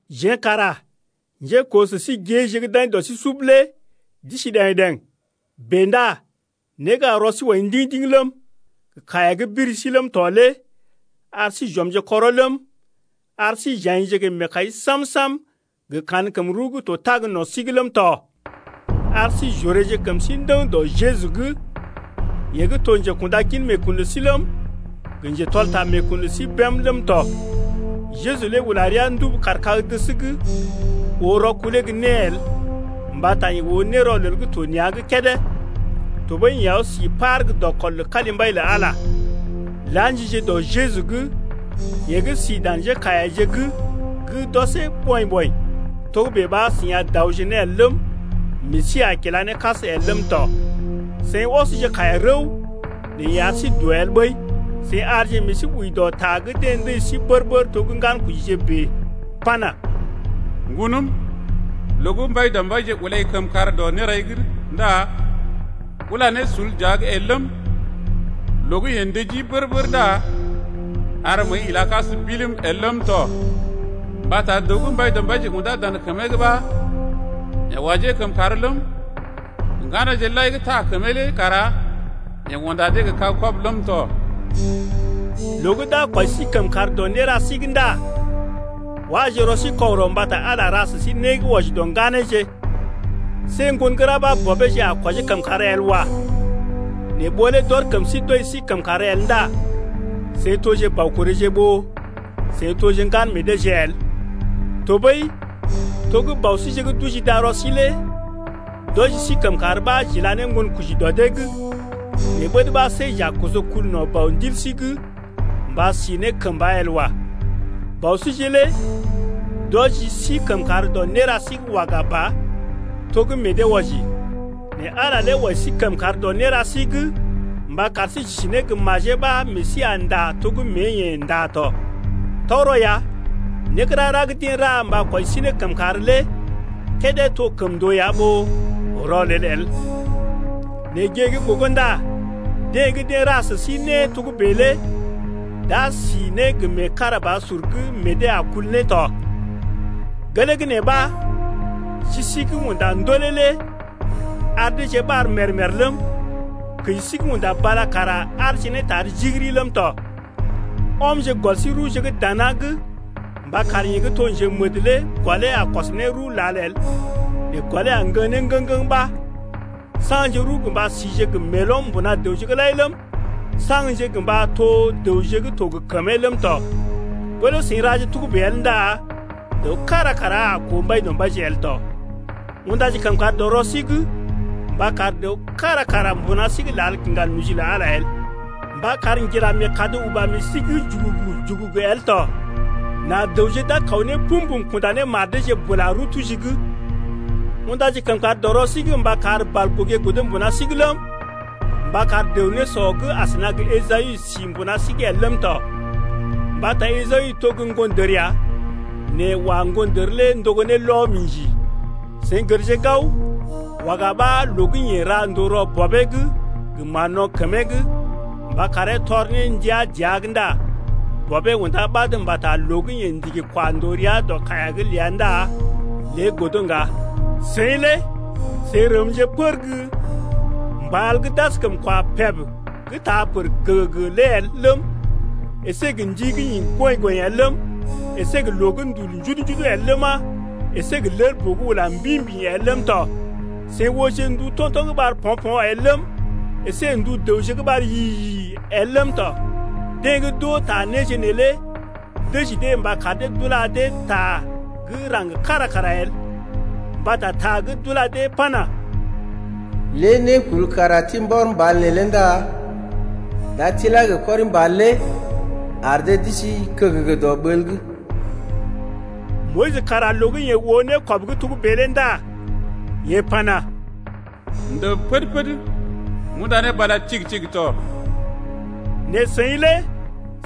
Jeḛ kara njékoo sə sí géeje gə́ d’aḭ dɔ sí sub lé d’isi ɗəŋ-ɗeŋ. Bèe ndá né gə́ ar rɔ sí wɔi ndiŋ-ndiŋ ləm, gə kaiya gə́ biri sí ləm tɔ lé ar sí j’ɔmje kɔrɔ ləm, ar sí j’aḭje gə meekai sam-sam gə kankəm rəw gə́ to tag no̰ sí’g ləm tɔ. Ar sí j’oreeje kəm sí ndəŋ dɔ Jeju’g, yeḛ gə́ to njekunda gin meekun lə sí ləm, gə njetɔl ta meekun lə sí bém ləm tɔ. Jeju lé ula rəa ndubu kaar kag-dəs’g oo rɔkulee gə́ né el mbata yeḛ oo nérɔlel gə́ to nea̰’g kédé, tɔɓəi yeḛ aw sí par gə́ dɔkɔl lə kalimbai lə Ala. La̰jije dɔ Jeju’g, yeḛ gə́ si dan njékaiyaje’g gə́ d’ɔsee ɓɔḭ-ɓɔḭ, togə́bè ɓa seḭ a daoje ne el ləm, meḛ sí a kila ne kas el ləm tɔ. Seḭ ɔsje kaiya rəw, nɛ yeḛ ar sí doo el ɓəi. Seḭ arje meḛ sí wəi dɔ ta gə́ deḛ ndəji sí bər-bər to gə́ ŋgankojije bèe pana: Ŋgonəm, loo gə́ Mbaidɔmbaije ulai kəmkàr dɔ nérai’g ndá ula ne sul dəa’g el ləm, Loo gə́ yeḛ ndəjii bər-bər ndá ar məəi ila kas bilim el ləm tɔ. Mbata dəw gə́ Mbaidɔmbaije undá dan kəmee’g ɓa yeḛ wɔjee kəmkàr ləm, Ŋganeeje lai gə́ taa kəmee lé kara yeḛ unda dee gə kag-kɔbə ləm tɔ. Loo gə́ d’a kwɔji sí kəmkàr dɔ néra sí’g ndá waje rɔ sí kɔgərɔ mbata Ala ra sə sí né gə́ wɔji dɔ ŋganeeje. See ŋgon gə́ ra ɓa bɔbeeje a kwɔjee kəmkàr el wa. Nɛ ɓó lé d’ɔr kəm sí d’wɔji sí kəmkàr el ndá seḭ toje baukoréje ɓó seḭ toje ŋgan meḛ deeje el. Tɔɓəi, to gə́ bɔ síje gə́ d’oji darɔ sí lé d’wɔji sí kəmkàr ɓa j’ila ne ŋgonkoji dɔ dee’g, nɛ ɓəd ɓa see j’a koso kul no̰ Bɔ ndil sí’g mba si ne kəmba el wa. Bɔ síje lé d’wɔji sí kəmkàr dɔ néra sí’g waga ba, to gə́ meḛ dee wɔji. Nɛ Ala lé wɔji sí kəmkàr dɔ néra sí’g mba kar sí j’isi ne gə majee ɓa meḛ sí a ndá to gə́ mée-yeḛ ndá tɔ. Tɔgərɔ ya, né gə́ rara gə́ deḛ ra mba kwɔji sí ne kəmkàr lé kédé to kəmndoo ya ɓó rɔlel el, nɛ gée gə́ gogo ndá deḛ gə́ deḛ ra sə dee né togə́bè lé d’a si ne gə meekarabasur gə́ meḛ dee a kul ne tɔ. Gelee gə́ nee ɓa ji sí gə́ unda ndolè lé ar deeje ɓar mèr-mèr ləm, kəji sí gə́ unda bala kara aarje ne tar jigiri ləm tɔ. Ɔmje gɔl sí rəwje gə́ dana’g mba kar yeḛ gə́ to njemədə lé gɔlee a kɔs ne rəw lal el, nɛ gɔlee a ŋgəŋ ne ŋgəŋ-ŋgəŋ ɓa. Saŋje rəw gə mba sije gə meelɔm mbuna dəwje’g lai ləm, saŋgje gə mba to dəwje gə́ to gə kəmee ləm tɔ. Ɓó lé seḭ raje togə́bè el ndá dəw kára kara a koo Mbaidɔmbaije el tɔ. Undaje kəmkàr dɔ rɔ sí’g mba kar dəw kára kara mbuna sí’g lal kiŋga noji lə Ala el, mba kar ŋgira meekad uba meḛ sí’g jugugu-jugugu el tɔ, nà dəwje d’a kaw ne pum-pum kunda ne mar deeje bula rəw tuji’g. Undaje kəmkàr dɔ rɔ sí’g mba kar balgogé godo mbuna sí’g ləm, mba kar dəw nésɔ gə́ asəna gə Esawu sí mbuna sí’g el ləm tɔ, mbata Esawu to gə́ ŋgondər ya, nɛ wa ŋgondər lé ndogo ne lɔ-mḭji. Seḭ gərje gao, waga ɓa loo gə́ yeḛ ra ndòo rɔ bɔbee’g gə mán-no̰ kəmee’g, mba karee tɔr ne ndia dəa’g ndá bɔbee undá ɓad mbata loo gə́ yeḛ ndigi kwa ndòo rəa dɔ kaiya’g ləa ndá lé godo ŋga. Seḭ lé seḭ rəmje pər gə́ mbal gə́ d’askəm kwa peb gə́ taa pər gəgəgə lé el ləm, əsé gə́ ndi gə́ ḭ goḭ-goḭ el ləm, əsé gə́ loo gə́ ndul njudu-njudu el ləma, əsé gə́ lel-boo gə́ ula mbḭ-mbḭ el ləm tɔ. Seḭ ooje ndu to̰to̰ gə́ ɓar po̰-po̰ el ləm, əsé ndu dəwje gə́ ɓar yi-yi el ləm tɔ. Deḛ gə́ d’oo ta néje neelé dəji dee mba kar dee d’ula dee ta gə́ raŋg kára kara el. Mbata ta gə́ d’ula dee pana: Lé nékul kara tibi mbɔr mbal neelé ndá d’a tilá gə kɔri-ər lé ar d’isi kəgəgə dɔ ɓəl’g. Moyis kara loo gə́ yeḛ oo nékɔb gə́ togə́bè lé ndá yeḛ pana: M’ndəb pəd-pəd m’unda ne bala tigi-tigi tɔ. Nɛ seḭ lé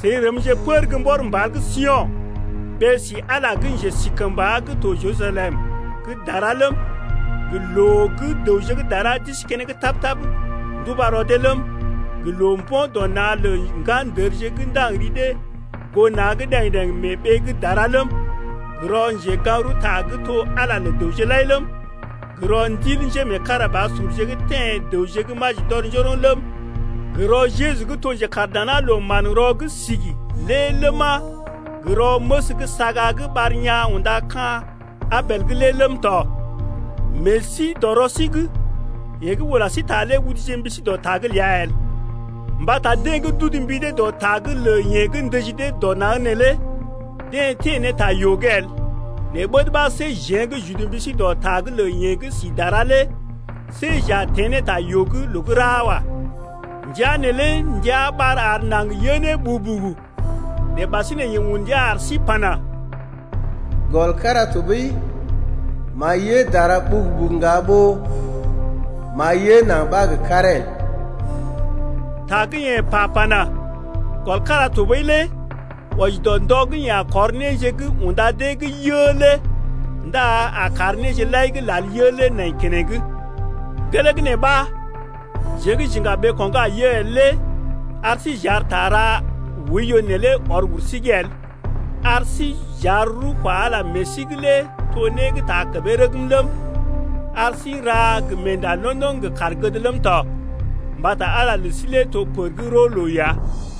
seḭ rəmje pər gə́ mbɔr mbal gə́ Sio̰, ɓee-si Ala gə́ Njesikəmba gə́ to Jerusalem gə́ dara ləm, gə́ loo gə́ dəwje gə́ dara d’isi keneŋ tap-tap nduba rɔ dee ləm, gə́ loo-mbo̰-dɔ-na̰ lə ŋgandərje gə́ ndaŋg ri dee goo na̰’g ɗəŋ-ɗeŋ mee ɓee gə́ dara ləm, gə́ rɔ njegaŋ-rəwta gə́ to Ala lə dəwje lai ləm, gə́ rɔ ndil njémeekarabasurje gə́ teḛ dəwje gə́ maji d’ɔr njoroŋ ləm, gə́ rɔ Jeju gə́ to njekaar dana loo manrɔ gə́ sigi’g lé ləma, gə́ rɔ məs gə́ saga gə́ ɓar yaa̰ unda ka̰ Abel’g lé ləm tɔ. Meḛ sí dɔ rɔ sí’g! Yeḛ gə́ ula sí ta lé uduje mbi sí dɔ ta’g ləa el. Mbata deḛ gə́ d’udu mbi dee dɔ ta’g lə yeḛ gə́ ndəji dee dɔ naŋg neelé deḛ teḛ ne ta yoo’g el, nɛ ɓəd ɓa see jeḛ gə́ j’udu mbi sí dɔ ta’g lə yeḛ gə́ si dara lé see j’a teḛ ta yoo’g loo gə́ ra wa. Ndəa neelé ndia ɓar ar naŋg yə ne ɓugu-ɓugu, nɛ ɓasinè yeḛ un ndia ar sí pana: Gɔl kára tɔɓəi m’a yə dara ɓugu-ɓugu ŋga ɓó m’a yə naŋg ɓa gə karee el. Ta gə́ yeḛ pa pana: Gɔl kára tɔɓəi lé wɔji dɔ ndɔ gə́ yeḛ a kɔr néje gə́ unda deḛ gə́ yə lé ndá a kar néje lai gə́ lal yə lé nai keneŋ. Gelee gə́ nee ɓa jeḛ gə́ j’iŋga ɓeeko̰ gə́ a yə el lé ar sí j’ar ta ra oiyo neelé ɔr wur sí’g el, ar sí j’ar rəw kwa Ala meḛ sí’g lé to ne gə́ taa kəmee rəgm ləm, ar sí n’ra gə meenda londoŋ gə kaar gəd ləm tɔ, mbata Ala lə sí lé to pər gə́ roo loo ya.